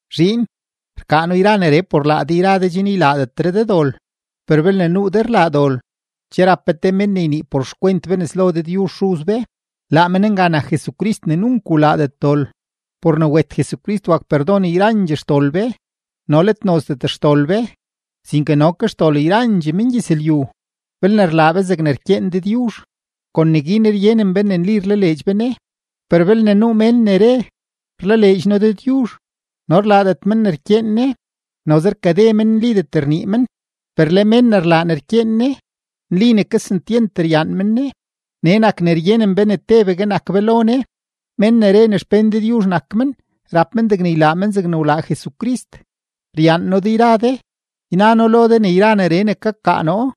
Zhiin, rkaa noo yra neree por laa de yra de chen ylaadetre de dol, per belne nuu de rlaa dol, che rap be te men ne ynii por xkwent be nes lo Dëdyuzh Xuz be. Laa men nga nak Jesucrist ne nunk wlaadet dol. Por ne wet Jesucrist wak perdon yrandxee xdol be no let nozdet xdol be, sinke no ke xdol yrandxee mengyëzlyu. Belne rlaa be zegne rkyeen Dëdyuzh, kon neguin ryenen be ne nli rlaleedx be Ne. Per belne nuu mén ne re: “Rlaleedx noo Dëdyuzh” no rlaadet men ne rkyeen Ne, noze rkade men, nlidet rnii men. Per le mén ne rlaa ne rkyeen Ne, nli ne kesentyent ryaan men Ne. Nee nak ne ryenen be ne tebegue nak be lo Ne. Mén ne re ne xpén Dëdyuzh nak men, rap men degne ylaa men zegne wlaa Jesucrist. Ryaan noo de yra de. Yna noo lo de ne yra neree ne kakaa noo,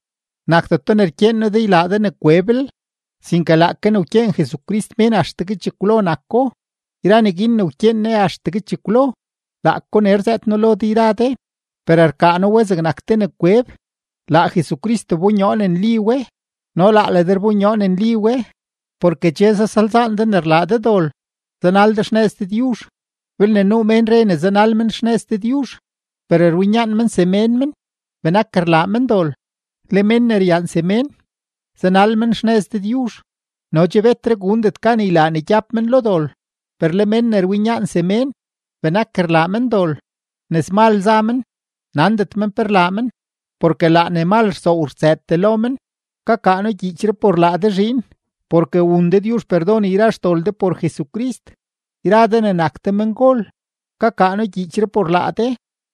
nakdeto ne rkyeen noo de ne ylaa de ne kweblel, sinke laake ne wkyeen Jesucrist mén axtegue chekwlo nako. Yra neguin ne wkyeen Ne axtegue chekwlo, laako nee rzëët noo lo de yra de. Per rkaa noo we zegnak te ne kweb; laa Jesucrist wbonyoo ne nli we no laa le de rbonyoo ne nli we, porke che zasalzaan de ne rlaa de dol, zanal de xnëz Dëdyuzh. Belne nuu mén re ne zanal men xnëz Dëdyuzh, per rwinyaan men semén men, benak rlaa men dol. Le mén ne ryaan semén, zanal men xnëz Dëdyuzh, no che betre gundet gan ylaa ne gyab men lo dol. Per le men ne rwinyaan semén, benak rlaa men dol, nëzmal za men, nandet men pe rlaa men, porke laa ne mal rsoow rtsëëtee lo men. Kakaa noo gyiichree por laa de zhiin, porke wun Dëdyuzh perdon yra xdol de por Jesucrist. Yra de ne nak de mengol, kakaa noo gyiichree por laa de,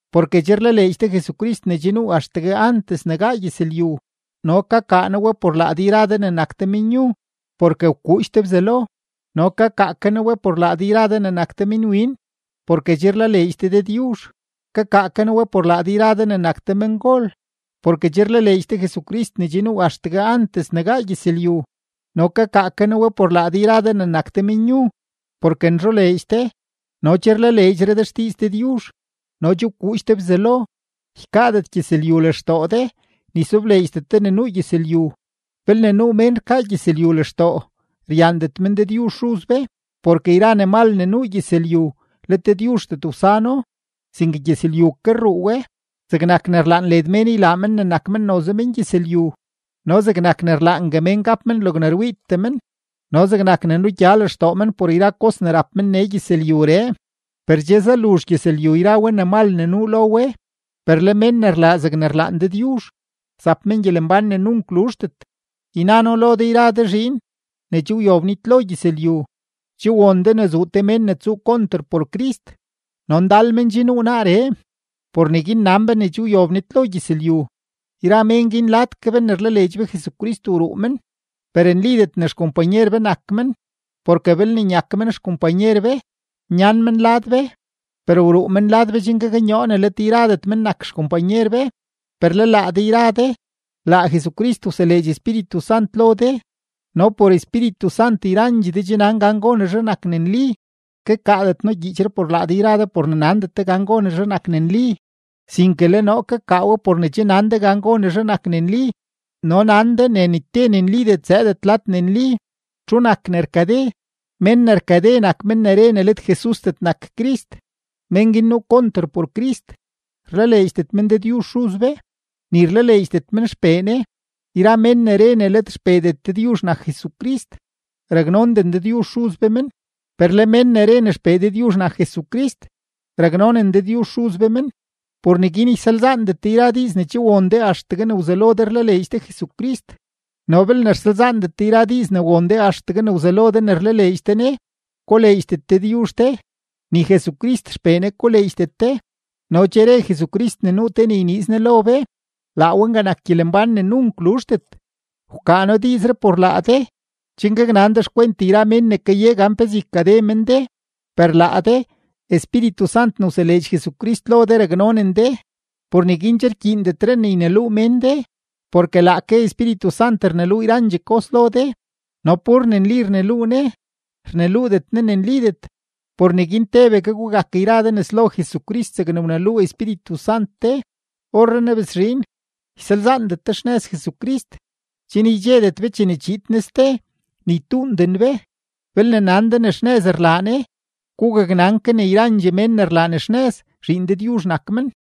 porke che rlaleedx de Jesucrist ne che nuu axtegue antes ne gaa gyëzlyu. No kakaa noo we por laa de yra de ne nak de menyu, porke wkuudx de Bzelo. No kakaa ke noo we por laa de yra de ne nak de minwin, porke che rlaleedx de Dëdyuzh. Kakaa ke noo we por laa de yra de ne nak de mengol, porke che rlaleedx de Jesucrist ne che nuu axtegue antes ne gaa gyëzlyu. No kakaa ke noo we por laa de yra de ne nak de menyu, porke nzholeedx de, no che rlaleedxre de xdiiz Dëdyuzh, no che wkuudx de Bzelo. Ykaadet gyëzlyu lextoo de, ni sobleedxdet de ne nuu gyëzlyu. Belne nuu mén rkaa gyëzlyu lextoo, ryaandet men Dëdyuzh Xuz be. Porke yra ne mal ne nuu gyëzlyu, let Dëdyuzhdet wsano, sinke gyëzlyu ke rruu we: zegnak ne rlaan led mén ylaa men ne nak men noze mengyëzlyu, no zegnak ne rlaangue mén gap men logne rwiitee men, no zegnak ne nugya lextoo men por yra kos ne rap men nee gyëzlyuree. Per che zaluzh gyëzlyu yra we ne mal ne nuu lo we. Per le mén ne rlaa zegne rlaan Dëdyuzh, zap men gyelembán ne nunk luzhdet. Yna noo lo de yra de zhiin, ne che wyob nitlo gyëzlyu. Che won de ne zuu te mén ne tsuu konter por Crist; no ndal men che nuu naaree. Por neguin nan be ne che wyob nitlo gyëzlyu. Yra mén guin lad ke be ne rlaleedx be Jesucrist wruu men, per nlidet ne xkompanyer be nak men, porke belne nyak men xkompanyer be, nyan men lad be. Per wruu men lad be chen gaknyoo ne let yradet men nak xkompanyer be. Per le laa de yra de, laa Jesucrist wseleedx Espíritu Sant lo de, no por Espíritu Sant yrandxee de che nan gan gonezhe nak ne nli. Kakaadet noo gyiichree por laa de por ne nandet de gan gonezhe nak ne nli, sinke le noo kakaa we por ne che nan de gan gonezhe nak ne nli no nan de ne ni te ne nlidet zëëdet lad ne nli. ¿Txu nak ne rkade? Mén ne rkade nak men ne re ne let Jesusdet nak Crist. Mén guin nuu konter por Crist, rlaleedxdet men Dëdyuzh Xuz be, ni rlaleedxdet men XPee Ne. Yra mén ne re ne let XPeedet Dëdyuzh nak Jesucrist, raknonden Dëdyuzh Xuz be men. Per le mén ne re ne XPee Dëdyuzh nak Jesucrist, raknonen Dëdyuzh Xuz be men. Por neguin ysalzaandet de yra diiz ne che won de axtegue ne wzelo de rlaleedx de Jesucrist. No belne rsalzaandet de yra diiz ne won de axtegue ne wzelo ne rlaleedx de Ne, koleedxdet Dëdyuzh de, ni Jesucrist XPee Ne koleedxdet de. No che re Jesucrist ne nuu te ne yniiz Ne lo be; laa we nga nak gyelembán ne nunk luzhdet. Wkaa noo diizree por laa de, chen gaknan de xkwent yra mén ne kaye gan pezee ykade men de. Per laa de, Espíritu Sant ne wseleedx Jesucrist lo de raknonen de, por neguin che rkyiindenre de ne yneluu mén de, porke laake Espíritu Sant rneluu yrandxee kos lo de, no pur ne nli rneluu Ne, rneluudet Ne ne nlidet. Por neguin tebegue gugak yra de nes lo Jesucrist zegne wneluu Espíritu Sant de. Orrenaa bes zhiin, ysalzaandet de xnëz Jesucrist, chen ydxedet be chene chiid Ne ste, ni ytuunden be. Belne nan de ne xnëz rlaa Ne, gugaknan ke ne yrandxee mén ne rlaa ne xnëz, zhiin Dëdyuzh nak men.